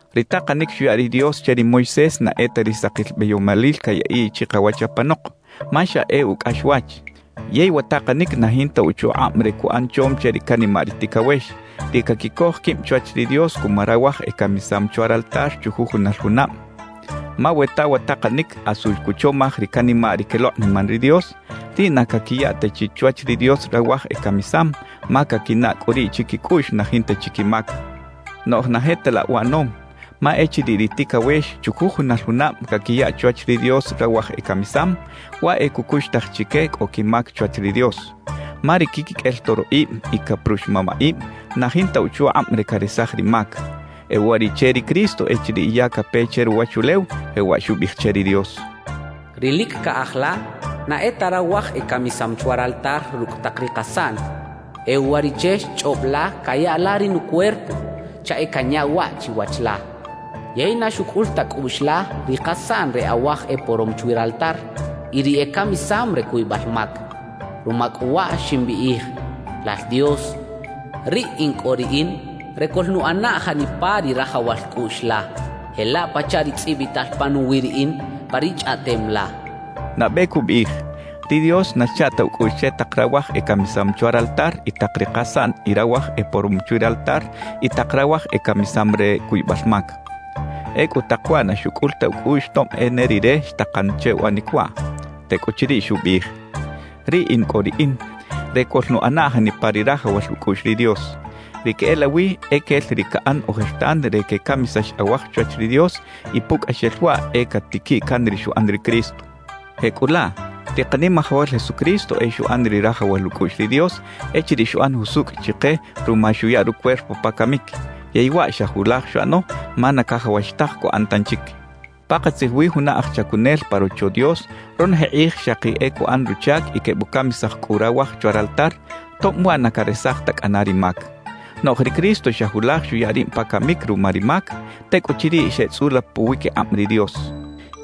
Ri takanic xuya ri Dios che ri Moisés na e ta ri sakil beyomalil cayaꞌiꞌ chikawach apanok, ma xa e ucꞌaxwach. Yey wa takanic na jinta uchukꞌab re cuꞌan chom che ri canimaꞌ ri ticawex, ri caquicoj quib chwach ri Dios cuma rawaj ecamisam chwa raltar chujujunal junab. Ma we ta wa takanic asu cuchomaj ri canimaꞌ ri quelokꞌniman ri Dios, riꞌ na caquiya ta chi chwach ri Dios rawaj ecamisam, ma caquinaꞌ cꞌu riꞌ chiquicꞌuꞌx na jinta chi quimac. Noꞌj na je ta laꞌ uꞌanom, ma echiriꞌ ri ticawex chujujunal junab caquiya chwach ri Dios rawaj ecamisam, waꞌ e cucuxtaj chique cꞌo quimac chwach ri Dios. Ma ri quiquiqꞌuel toroꞌib y caprux mamaꞌib na jinta uchukꞌab re caresaj ri mac. E uwariꞌche ri Cristo echiriꞌ ya cape che ruwachulew, jewaꞌ xubiꞌij che ri Dios: Ri lic caꞌaj la na e ta rawaj ecamisam chwa raltar rucꞌ tak ri kasaꞌn; e uwariꞌche xchꞌob la caya la ri nucuerpo chaꞌ e canya waꞌ chiwach la. Yey na xucꞌul ta cꞌuꞌx la ri kasaꞌn re awaj eporom chwi raltar y ri ecamisam re cuybal mac. Ruma cꞌu waꞌ ximbiꞌij: Lal Dios, riꞌ in cꞌo Riꞌin re coꞌlnuꞌana janipa ri rajawal cꞌuꞌx la, jelaꞌ pachaꞌ ri tzꞌibital panuwiꞌ Riꞌin pa ri Chꞌaꞌtem la xchaꞌ. Nabe cubiꞌij: «Ri Dios na xcha ta ucꞌuꞌx che tak rawaj ecamisam chwa raltar y tak ri kasaꞌn y rawaj eporom chwi raltar y tak rawaj ecamisam re cuybal mac.» Ecꞌu tak waꞌ na xucꞌul ta ucꞌuꞌx tob e ne Rire xtakan che uꞌanic waꞌ. Tecꞌuchiriꞌ xubiꞌij: «Riꞌ in cꞌo Riꞌin re coꞌlnuꞌana janipa ri rajawal ucꞌuꞌx ri Dios.» Ri queꞌelawi e quel ri caꞌan ojertan re quecamisax awaj chwach ri Dios y pucꞌaxel waꞌ e catiquiꞌ can ri xuꞌan ri Cristo. Jecꞌulaꞌ ri Kanimajawal Jesucristo e xuꞌan ri rajawal ucꞌuꞌx ri Dios echiriꞌ xuꞌan jusucꞌ chike ruma xuya rucuerpo pa camic; yey waꞌ xa julaj xuꞌano ma na cajawax taj cuꞌan tanchic. Pakatzij wi juna aj chacunel pa Rocho Dios ronoje kꞌij xaki e cuꞌan ruchac y quebucamisaj cꞌu rawaj chwa raltar, tob waꞌ na caresaj ta cꞌana ri mac. Noꞌj ri Cristo xa julaj xuya rib pa camic ruma ri mac; tecꞌuchiriꞌ xeꞌtzꞌula puwiquikꞌab ri Dios.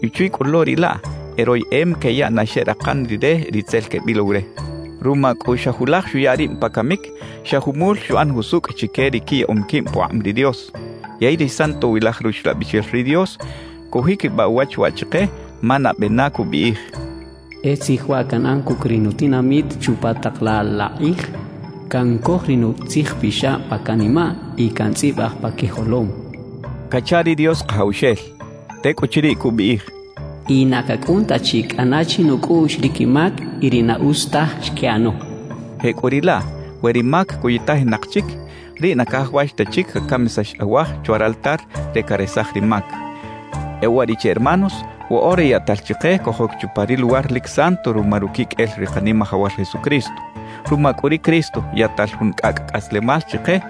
Y chwi cꞌu lo riꞌ laꞌ, e royeꞌem queyaꞌ na xeꞌrakan Rire ri tzel quebilow re. Ruma cꞌu xa julaj xuya rib pa camic, xa jumul xuꞌan jusucꞌ chique ri quiyaꞌom quib pukꞌab ri Dios. Yey ri Santowilaj Ruxlabixel ri Dios cujiquibaꞌ uwach waꞌ chike, ma nabe na cubiꞌij: E tzij waꞌ canꞌan cucꞌ ri nutinamit chupa tak laꞌ la kꞌij: Cancoj ri nutzijpixab pa canimaꞌ y cantzꞌibaj pa quijolom, cacha ri Dios Kajawxel. Tecꞌuchiriꞌ cubiꞌij: Y na cacꞌun ta chi cꞌana chinucꞌuꞌx ri quimac y ri na utz taj xquiꞌano cachaꞌ. Jecꞌuriꞌlaꞌ, we ri mac cuytajinak chic, riꞌ na cajawax ta chic cacamisax awaj chwa raltar re caresaj ri mac. E uwariꞌche hermanos, woꞌora yaꞌtal chike cojoc chupa ri Luwar lic Santo ruma ruquiqꞌuel ri Kanimajawal Jesucristo. Ruma cꞌu ri Cristo, yaꞌtal jun cꞌacꞌ cꞌaslemal chike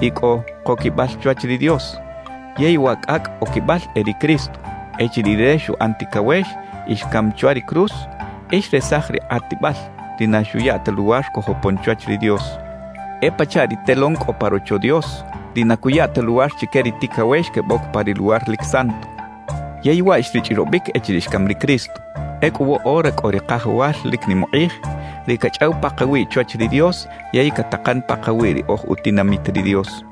y cꞌo koquibal chwach ri Dios, yey wa cꞌacꞌ oquibal e ri Cristo. Echiriꞌ Rire xuꞌan ticawex y xcam chwa ri cruz, e xresaj ri kꞌatibal, ri na xuya ta luwar cojopon chwach ri Dios. E pachaꞌ ri telón cꞌo pa Rocho Dios, ri na cuya ta luwar chique ri ticawex queboc pa ri Luwar lic Santo. Yey waꞌ xrichꞌrobic echiriꞌ xcam ri Cristo. Ecꞌu woꞌora cꞌo ri Kajawal lic nim ukꞌij, ri cachꞌaw pakawiꞌ chwach ri Dios yey catakan pakawiꞌ ri oj utinamit ri Dios.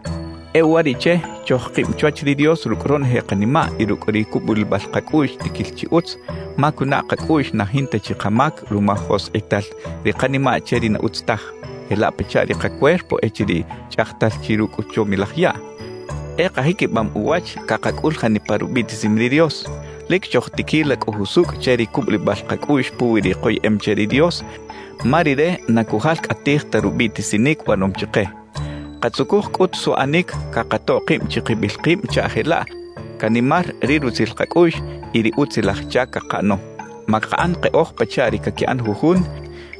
E uwariꞌche chojkib chwach ri Dios rucꞌ ronoje kanimaꞌ y rucꞌ ri cubulibal kacꞌuꞌx tiquil chi utz, ma cunaꞌ kacꞌuꞌx na jinta chi kamac ruma joskꞌital ri kanimaꞌ che ri na utz taj, jelaꞌ pachaꞌ ri kacuerpo echiriꞌ chꞌajtal chi rucꞌ chomilaj yaꞌ. E kajiquibam uwach cakacꞌul janipa rubiꞌtisim ri Dios; lic chojtiquila cꞌu jusucꞌ che ri cubulibal kacꞌuꞌx puwi ri koyeꞌem che ri Dios, ma Rire na cujalcꞌatij ta rubiꞌtisinic uꞌanom chike. Katzucuj cꞌut suꞌanic cakatoꞌ kib chikibil kib chaꞌ jelaꞌ canimar ri rutzil kacꞌuꞌx y ri utzilaj chac cakaꞌano. Makaꞌan keꞌoj pachaꞌ ri caquiꞌan jujun,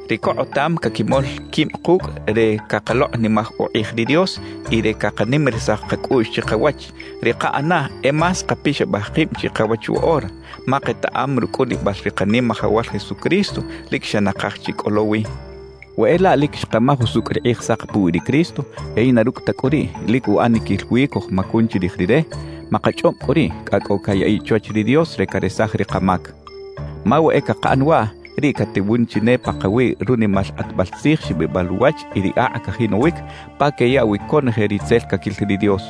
ri cokꞌotam caquimol quib kucꞌ re cakalokꞌnimaj ukꞌij ri Dios y re cakanimarisaj kacꞌuꞌx chikawach; ri kaꞌanaꞌ e más kapixabaj kib chikawach woꞌora, ma ketaꞌam rucꞌunibal ri Kanimajawal Jesucristo lic xa nakaj chi cꞌo lo wi. We e laꞌ lic xkamaj usucꞌ ri Kꞌijsak puwi ri Cristo, yey na rucꞌ ta cꞌu riꞌ, lic uꞌaniquil wi cojmacun chirij Rire, makachꞌob cꞌu riꞌ, cꞌa cꞌo cayaꞌiꞌ chwach ri Dios re caresaj ri kamac. Ma we e cakaꞌan waꞌ, riꞌ catewun chi ne pakawiꞌ runimal kꞌatbal tzij xibibal uwach y ri akꞌ cajinowic pa queyaꞌ wi conoje ri tzel caquil ri Dios.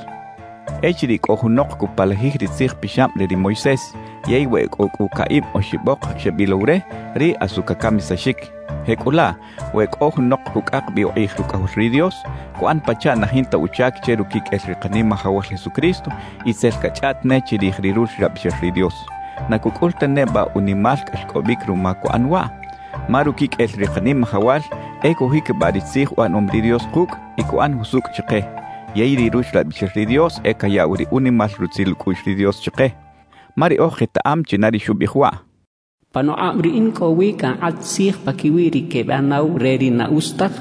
Echiriꞌ cꞌo junok cupalajij ri Tzij Pixab re ri Moisés, yey we e cꞌo cꞌu caꞌib oxibok xebilow re, riꞌ asu cacamisaxic. Jecꞌulaꞌ, we cꞌo junok cucꞌak bi ukꞌij Rucꞌajol ri Dios, cuꞌan pachaꞌ na jinta uchac che ruquiqꞌuel ri Kanimajawal Jesucristo y tzel cachꞌaꞌt ne chirij ri Ruxlabixel ri Dios ¿na cucꞌul ta neba unimal cꞌaxcꞌobic ruma cuꞌan waꞌ? Ma ruquiqꞌuel ri Kanimajawal e cujiquibaꞌ ri tzij uꞌanom ri Dios kucꞌ y cuꞌan jusucꞌ chike; yey ri Ruxlabixel ri Dios e cayaꞌw ri unimal rutzil ucꞌuꞌx ri Dios chike. Ma riꞌoj ketaꞌam china ri xubiꞌij waꞌ: Panukꞌab Riꞌin cꞌo wi cankꞌat tzij paquiwi ri quebanaw re ri na utz taj;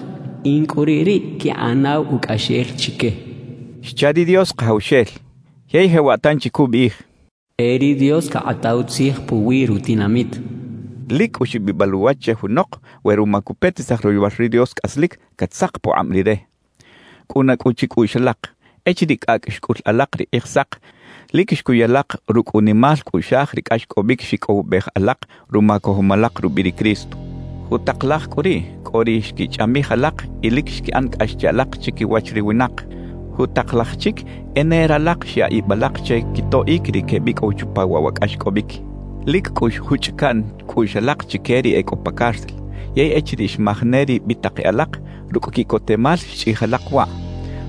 In cꞌu riꞌ ri quinꞌanaw ucꞌaxel chique xcha ri Dios Kajawxel. Yey jewaꞌ tanchi cubiꞌij: E ri Dios cakꞌataw tzij puwi rutinamit cachaꞌ. ¡Lic cꞌu xibibal uwach che junok we ruma cupetisaj royowal ri Dios cꞌaslic, catzak pukꞌab Rire! Cꞌuna cꞌu chicꞌuꞌx alak, echiriꞌ cꞌacꞌ xcꞌul alak ri Kꞌijsak, lic xcuy alak rucꞌ unimal cꞌuꞌxaj ri cꞌaxcꞌobic xicꞌowibej alak ruma cojom alak rubiꞌ ri Cristo. Jutak laj cꞌu riꞌ, cꞌo ri xquichꞌamij alak y lic xquiꞌan cꞌax che alak chiquiwach ri winak; jutak laj chic e ne ralak xyaꞌ ib alak che quitoꞌic ri quebicꞌow chupa waꞌ wa cꞌaxcꞌobic. Lic cꞌu xjuchꞌ caꞌn cꞌuꞌx alak chique ri e cꞌo pa cárcel. Yey echiriꞌ xmaj ne ri bitak e alak, rucꞌ quiꞌcotemal xchꞌij alak waꞌ.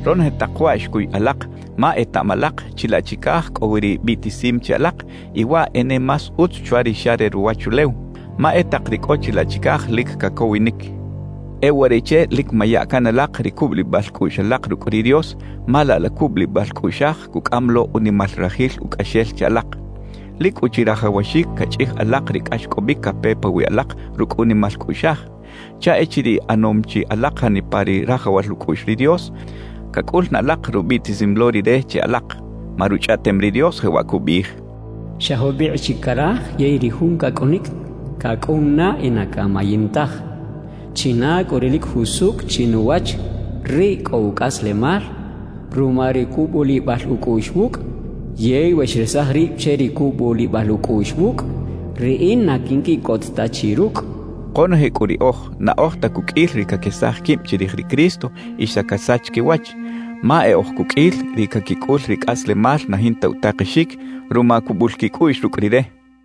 Ronoje tak waꞌ xcuy alak ma etaꞌam alak chilaꞌ chicaj cꞌo wi ri biꞌtisim che alak y waꞌ e ne más utz chwa ri xa re ruwachulew, ma e tak ri cꞌo chilaꞌ chicaj lic cacowinic. E uwariꞌche lic maya can alak ri cubulibal cꞌuꞌx alak rucꞌ ri Dios, ma laꞌ la cubulibal cꞌuꞌxaj cucꞌam lo unimal rajil ucꞌaxel che alak. Lic cꞌu chirajawaxic cachꞌij alak ri cꞌaxcꞌobic cape pawiꞌ alak rucꞌ unimal cꞌuꞌxaj, chaꞌ echiriꞌ ꞌanom chi alak janipa ri rajawal ucꞌuꞌx ri Dios, cacꞌul na alak rubiꞌtisim lo Rire che alak. Ma Ruchꞌaꞌtem ri Dios jewaꞌ cubiꞌij: Xa jubikꞌ chi caraj, yey ri Jun cacꞌunic, cacꞌun na y na camayin taj. China cꞌu ri lic jusucꞌ chinuwach, riꞌ cꞌo ucꞌaslemal ruma ri cubulibal ucꞌuꞌx wucꞌ. Yey we xresaj rib che ri cubulibal ucꞌuꞌx wucꞌ; Riꞌin na quinquiꞌcot ta chi rucꞌ cachaꞌ. Konoje cꞌu riꞌoj, na oj ta cuqꞌuil ri caquesaj quib chirij ri Cristo y xa casach quiwach, ma e oj cuqꞌuil ri caquicꞌul ri cꞌaslemal na jinta utakexic ruma cubul quicꞌuꞌx rucꞌ Rire.